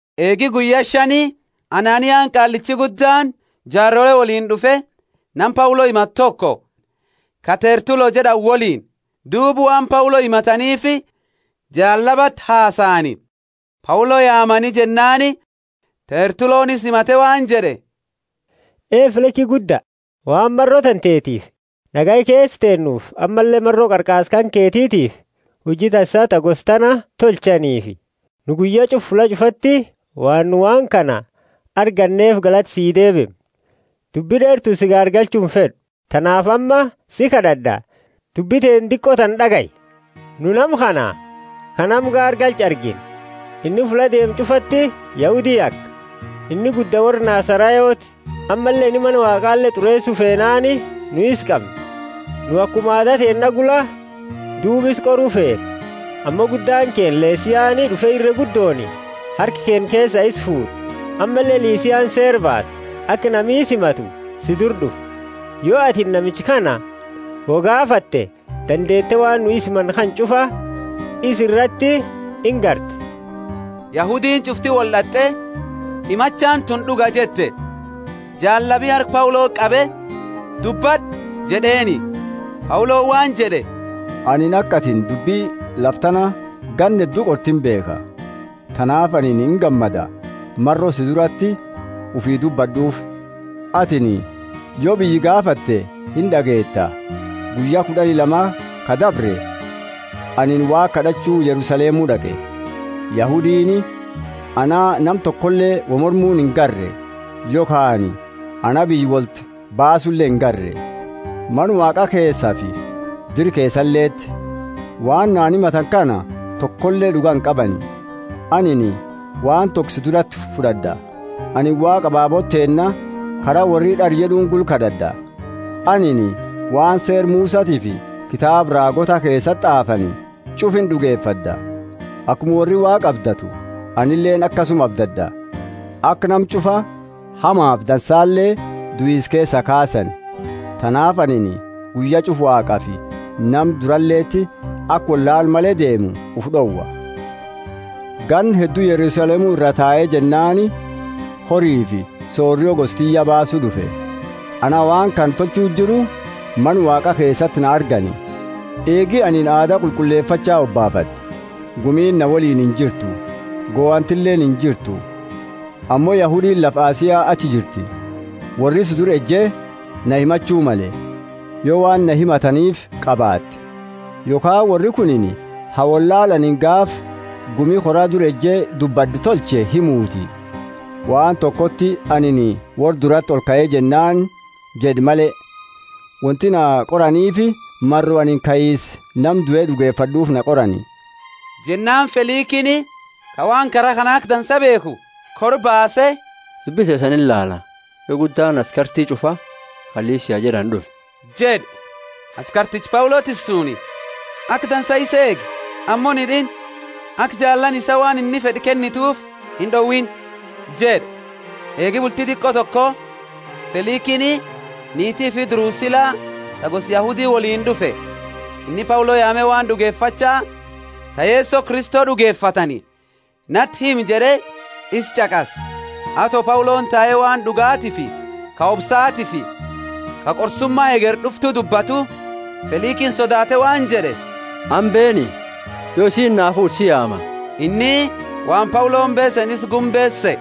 Eegi guyya shani Ananiani, Qaallichi Guddaani, jaarole woliini d'ufe, nama Paulo himatu toko, ka Tertulo jed'ani woliini. Duuba waan Paulo himataniifi jaallabati hasaani. Paulo yaamani jennaani Tertuloni isa himate waan jed'e, Ee Feliki gudda, waan maro tantetiifi nagaya keesa teennuufi, ammalle maro qarqaarsa kanketitiifi huji dansa ta gosa tana tolchanifi, nu guyya ch'ufa fulla ch'ufati waan nu waan kana arganneefi galata sii deebimna. Dubbi d'eertuuni si gaargalchu imfed'u, tanaafi amma si kad'ad'a, dubbi teenna diqo tana d'agayi. Nu nama kana ka nama gaargalchu argine; inni fulla deemu ch'ufati Yahudi yaka; inni gudda worra Nazarayoti. Ammalle inni Mana Waaqale t'ureesu feenaani nu isa qamne. Nu akuma aada teenna gula duuba isaa qoru feene, ammo guddaani keenna Lisiani d'ufe irre guddooni harka keenna keesaa isa fuud'e. Ammalle Lisiani seera baase, aka nami isa himatu si dura d'ufu. Yo atini namicha kana wo gaafate, dandeete waan nu isa himannu kana ch'ufa isa irati ingarta. Yahudiini ch'ufti wold'ate, Himachaani tunini d'uga jette. Jaallabi harka Pauloti qabe, Dubbad'u, jed'eeni. Pauloni waan jed'e, Anini aka atini dubbi lafa tana ganna heddu qorte imbeekha, tanaafi anini ingammada, maro si durati ufii dubbad'uufi. Atini yo biyya gaafatte ind'ageeta, guyya kud'ani lama ka dabre, anini Waaqa kad'achu Yerusalemu d'aqe. Yahudiini ana nama tokoleeni wo mormu inagarre yokhaani ana biyya wolti baasule ingarre, Mana Waaqa keesafi dira keesaleti. Waan na himatani kana tokole d'uga inqabani. Anini waan toko si durati fud'ad'a. Anini Waaqa ababoota teenna Kara worri d'ara jed'uuni gula kad'ad'a. Anini waan Seera Musatiifi kitaaba raagoota keesati t'aafani ch'ufa ind'ugefad'a. Akuma worri Waaqa abdatu, anileeni akasuma abdad'a, aka nama ch'ufa, hamafi dansale, duisa keesaa kaasani. Tanaafi anini guyya ch'ufa Waaqafi nama duraleti aka wollaala male deemu ufi d'owa. Ganna heddu Yerusalemu iraa tae jennaani horifi sorio gosa tiyya baasu d'ufe. Anaa waan kana tolchu jiru Mana Waaqa keesati na argani, eegi anini aada qulqullefacha hobaafad'e. Gumiini na woliini injirtu, gohantileeni injirtu. Ammo Yahudiini lafa Asia achi jirti, worri si dura eje na himachu male, yo waan na himataniifi qabaate. Yokhaani worri kunini ha wollaala anini gaafa gumi kora dura eje dubbad'e tolche himuti, waan tokoti anini worra durati olkae jennaani jed'e male. Wonti na qoraniifi maro anini kaisa nama due d'ugefad'uufi na qorani. Jennaani Felikini, ka waan kara kana aka dansa beekhu, kora baase dubbi teesani inilaala yo guddaani askarti ch'ufa ka Lisia jed'ani d'ufe jed'e. Askarticha Paulo tissuuni, Aka dansa isa eegi ammo inhid'iini, aka jaalaani isaa waan inni fed'u kennituufi ind'owiini jed'e. Eegi bulti diqo toko Felikini, niiti ufi Drusila ta gosa Yahudi, woliini d'ufe. Inni Paulo yaame waan d'ugefacha ta Yeso Kristo d'ugefatani nati himi jed'e, isa ch'aqase. Ato Pauloni tae waan d'ugaatifi ka obsaatifi ka qorsuma hegeri d'uftu dubbatu, Felikini sodaate waan jed'e, amma beeni, yo isiini naa fuute si yaama. Inni waan Pauloni beeseni isa gumbeesu sehe.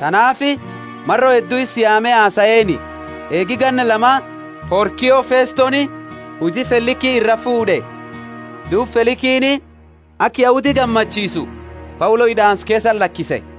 Tanaafi maro heddu isa yaame hasaeeni. Eegi ganna lama Porkio Festoni huji Feliki iraa fuud'e. Duuba Felikini aka Yahudi gammachiisu Paulo hid'aansa keesati lakise.